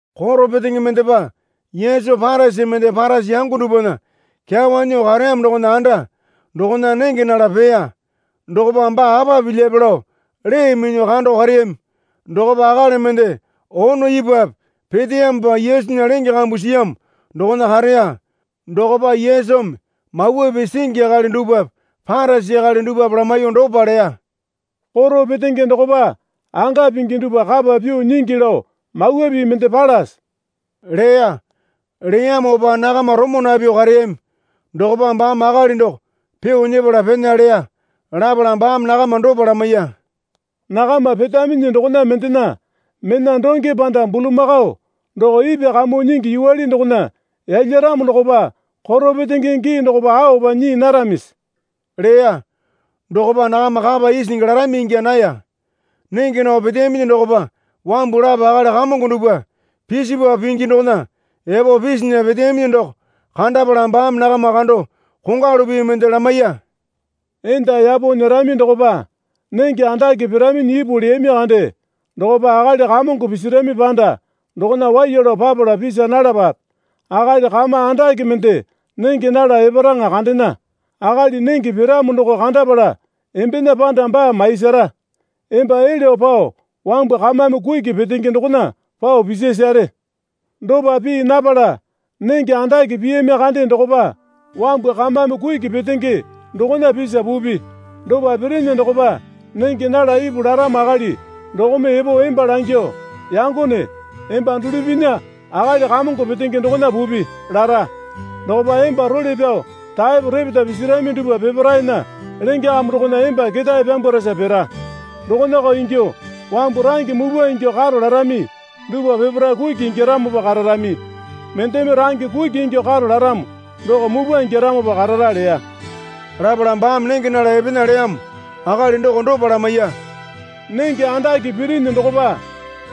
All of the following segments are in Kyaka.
Koro petenge mendepa Yesu Parisi mende Parisi yango dupwana kyawa nyuo kareyamo dokona anda dokona nenge nala peya. Dokopa baa apa pilyape lao lee minyuo kando kareyami. Dokopa akali mende ono ipwape peteyamopa Yesunya lenge kambu siyamo dokona kareya. Dokopa Yesumi Mawa Pii singi akali dupwape Parisi akali dupwape lamaiyuo dopa leya. Koro petenge dokopa anga pingi dupwa kapa pyuo nyingi lao Mawa Pii mende palase? leya. Leyamopa nakama romo napyuo kareyami. Dokopa baame akali doko pyuo nyepala pena leya. Lapala baame nakama dopa lamaiya. Nakama petaminyi dokona mendena mena donge panda bulamakao doko ipwa kamuo nyingi yuwale dokona yalyaramo dokopa koro petenge gii dokopa aopa nyii naramisi? leya. Dokopa nakama kapa isingi larami ingya naya. Nenge nao peteyaminyi dokopa wambu lapo akali Kamongo dupwa pisipapu pingi dokona epo pisinya peteyaminyi doko kandapala baame nakama kando kongwalu pii mende lamaiya. Enda yapo nyerami dokopa nenge andake piraminyi ipu leyami kande dokopa akali Kamongo pisirami panda dokona waiya lao papala pisa nalapape. Akali kama andake mende nenge nala eparaŋa kandena. Akali nenge piramo doko kandapala embena panda baa maiyasara. Emba elyuo pao wambu kamame kuki petenge dokona pao pisasare. Dopa pii napala nenge andake piyami kande dokopa wambu kamame kuki petenge dokona pisa pupi. Dopa pirinyi dokopa nenge nala ipu laramo akali dokome epo emba langyuo, Yangone, emba dulupinya akali kamongo petenge dokona pupi, lara. Dokopa emba role pyao taepo repeta pisirami dupwa peparaena lenge kambu dokona emba ketae pyambwarasa pira. Dokonako ingyuo wambu range mupwa ingyuo karo larami dupwa peparae kuki ingyaramopa kararami. Mendeme range kuki ingyuo karo laramo doko mupwa ingyaramopa karara leya. Lapala baame nenge nala epena leyamo akali doko dopa lamaiya. Nenge andake pirinyi dokopa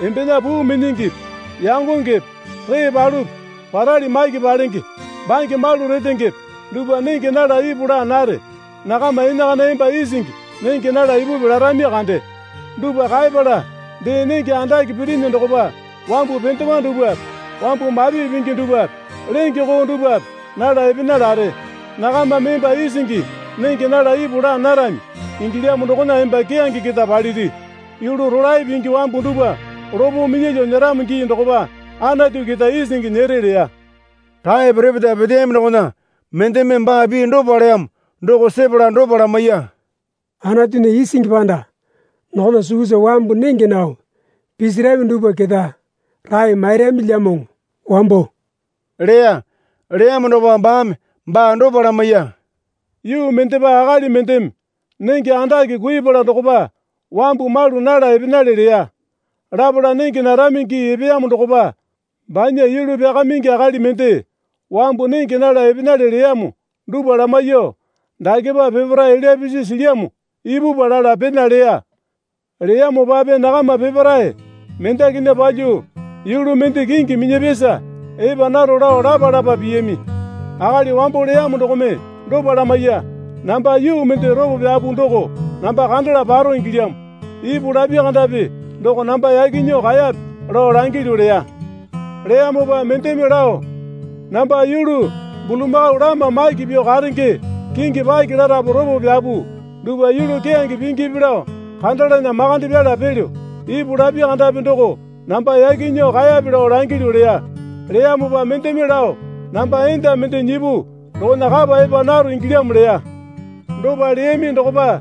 embena puu minyingipi yangongepe ree palupi parali maki palenge bange malu retengepe dupwa nenge nala ipu laa nare. Nakama enakana emba isingi nenge nala ipupi larami kande. Dupwa kaepala dee nenge andake pirinyi dokopa wambu pendewa dupwape wambu mapi pingi dupwape lenge koo dupwape nala epena lare. Nakamame emba isingi nenge nala ipu laa narami ingilyamo dokona emba keyange keta paliri. Yulu rolae pingi wambu dupwa lopo minyalyuo nyeramo gii dokopa Anatu keta isingi nyere leya. Taepo repeta peteyaminyi dokona mendeme baa pii dopa leyamo doko sepala dopa lamaiya. Anatunya isingi panda dokona sukusa wambu nenge nao pisirami dupwa keta rae mairamilyamoŋo wambo leya. Leyamo dokopa baame baa dopa lamaiya. Yuu mendepa akali mendeme nenge andake kuiyapala dokopa wambu malu nala epenale leya. Lapala nenge narami gii epeyamo dokopa banya yulu pyakamingi akali mende wambu nenge nala epenale leyamo dupwa lamaiyuo, Dakepa peparae elya pisi silyamo ipupwa, lala pena leya. Leyamopape nakama peparae mendakinya palyuo yulu mende kingi minyapyasa epa naro lao lapa lapa piyami. Akali wambo leyamo dokome dopa lamaiya. Namba yuu mende ropo pyapu doko namba kandala paro ingilyamo. Ipu lapi kandapi doko namba yaki nyuo kaeyape lao langilyu, leya. Leyamopa mendeme lao, Namba yulu bulamakao lama maki pyuo karenge kingi paki larapu ropo pyapu dupwa yulu keyange pingipi lao kandalana makande pyala pelyo. Ipu lapi kandapi doko namba yaki nyuo kaeyape lao langilyu leya. Leyamopa mendeme lao, Namba enda mende nyipu dokona kapa epa naro ingilyamo leya. Dopa leyami dokopa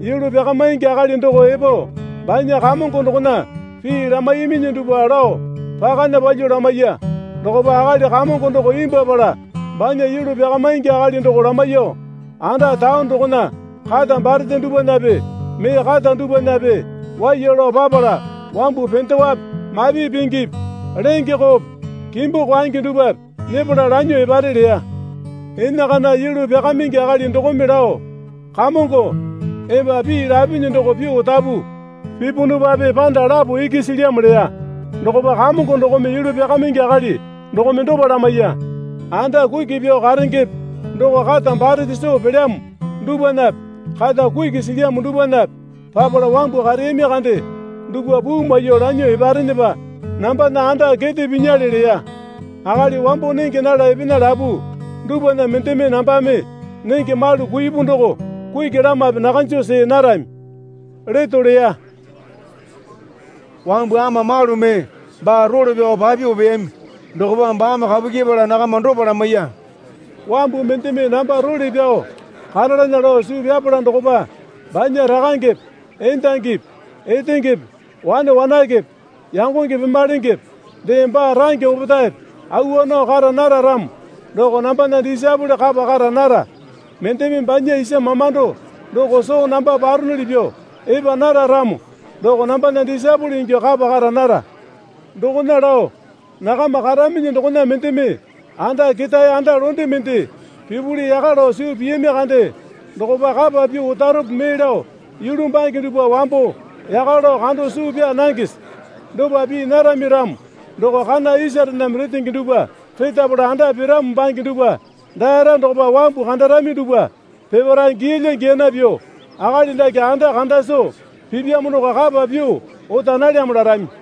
yulu pyakamaingi akali doko epo banya kamongo dokona pii lamaiyaminyi dupwa lao pakana palyuo lamaiya. Dokopa akali kamongo doko imbwuapala banya yulu pyakamaingi akali doko lamaiyuo, Anda taone dokona kata barete dupwanape mee kata dupwanape waiya lao papala wambu pendewape mapi pingipi lenge koope kimbu kwaenge dupwape nyepala lanyuo epare leya. Enakana yulu pyakamaingi akali dokome lao Kamongo, emba pii lapinyi doko pyuo otapu. Pipunupape panda lapo iki silyamo leya. Dokopa kamongo dokome yulu pyakamaingi akali dokome dopa lamaiya. Anda kuki pyuo karengepe doko kata barete soo pelyamo dupwanape kata kuki silyamo dupwanape papala wambu kareyami kande dupwa puu maiyuo lanyuo eparenepa nambana anda kete pinyale leya. Akali wambo nenge nala epena lapu dupwana mendeme nambame nenge malu kuipu doko kuki lamape nakanjo see narami leto leya. Wambu ama malu mee baa role pyao papyuo peyami. Dokopa baame kapu kyepala nakama dopa lamaiya. Wambu mendeme namba role pyao karalana lao suu pyapala dokopa banya rakangepe endangipi etengepe wane wanakepe yangonge pemalengepe dee baa range opetaepe awa nao kara nara ramo doko nambana disaepole kapa kara nara. Mendeme banya isa mamando doko soo namba paronuli pyuo epa nara ramo doko nambana disaepole ingyuo kapa kara nara. Dokona lao nakama karaminyi dokona mendeme anda ketae anda londe mende pipuli yaka lao suu piyami kande dokopa kapa pyuo otarope mee lao yulu bange dupwa wambo yaka lao kando suu pyaa nangese? Dopa pii narami ramo doko kana isarename retenge dupwa retapala anda piramo bange dupwa daara dokopa wambu kandarami dupwa peparae giyalya giyana pyuo, Akali dake anda kanda soo pipyamo doko kapa pyuo ota nalyamo larami.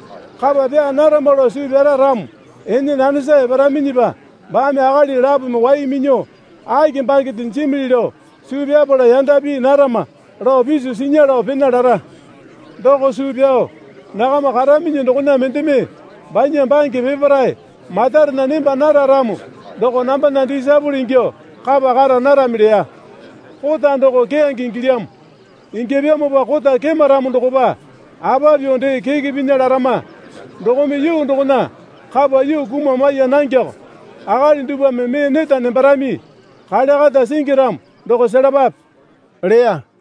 Kapa pyaa narama lao suu pyara ramo ene nanesa eparaminyipa baame akali lapome wai minyuo, Aki bangende jimili lao suu pyapala yanda pii narama, lao piso sinya lao pena lara. Doko suu pyao nakama karaminyi dokona mendeme banya bange peparae matarena nemba nara ramo doko nambana disaepole ingyuo kapa kara narami leya. Kota doko keyange ingilyamo. Ingyapyamopa kota kema ramo dokopa apa pyuo dee keke pinya larama. Dokome yuu dokona kapa yuu kuma maiya nangeoko. Akali dupwame mee neta nembarami. Kale kata singi ramo doko selapape leya.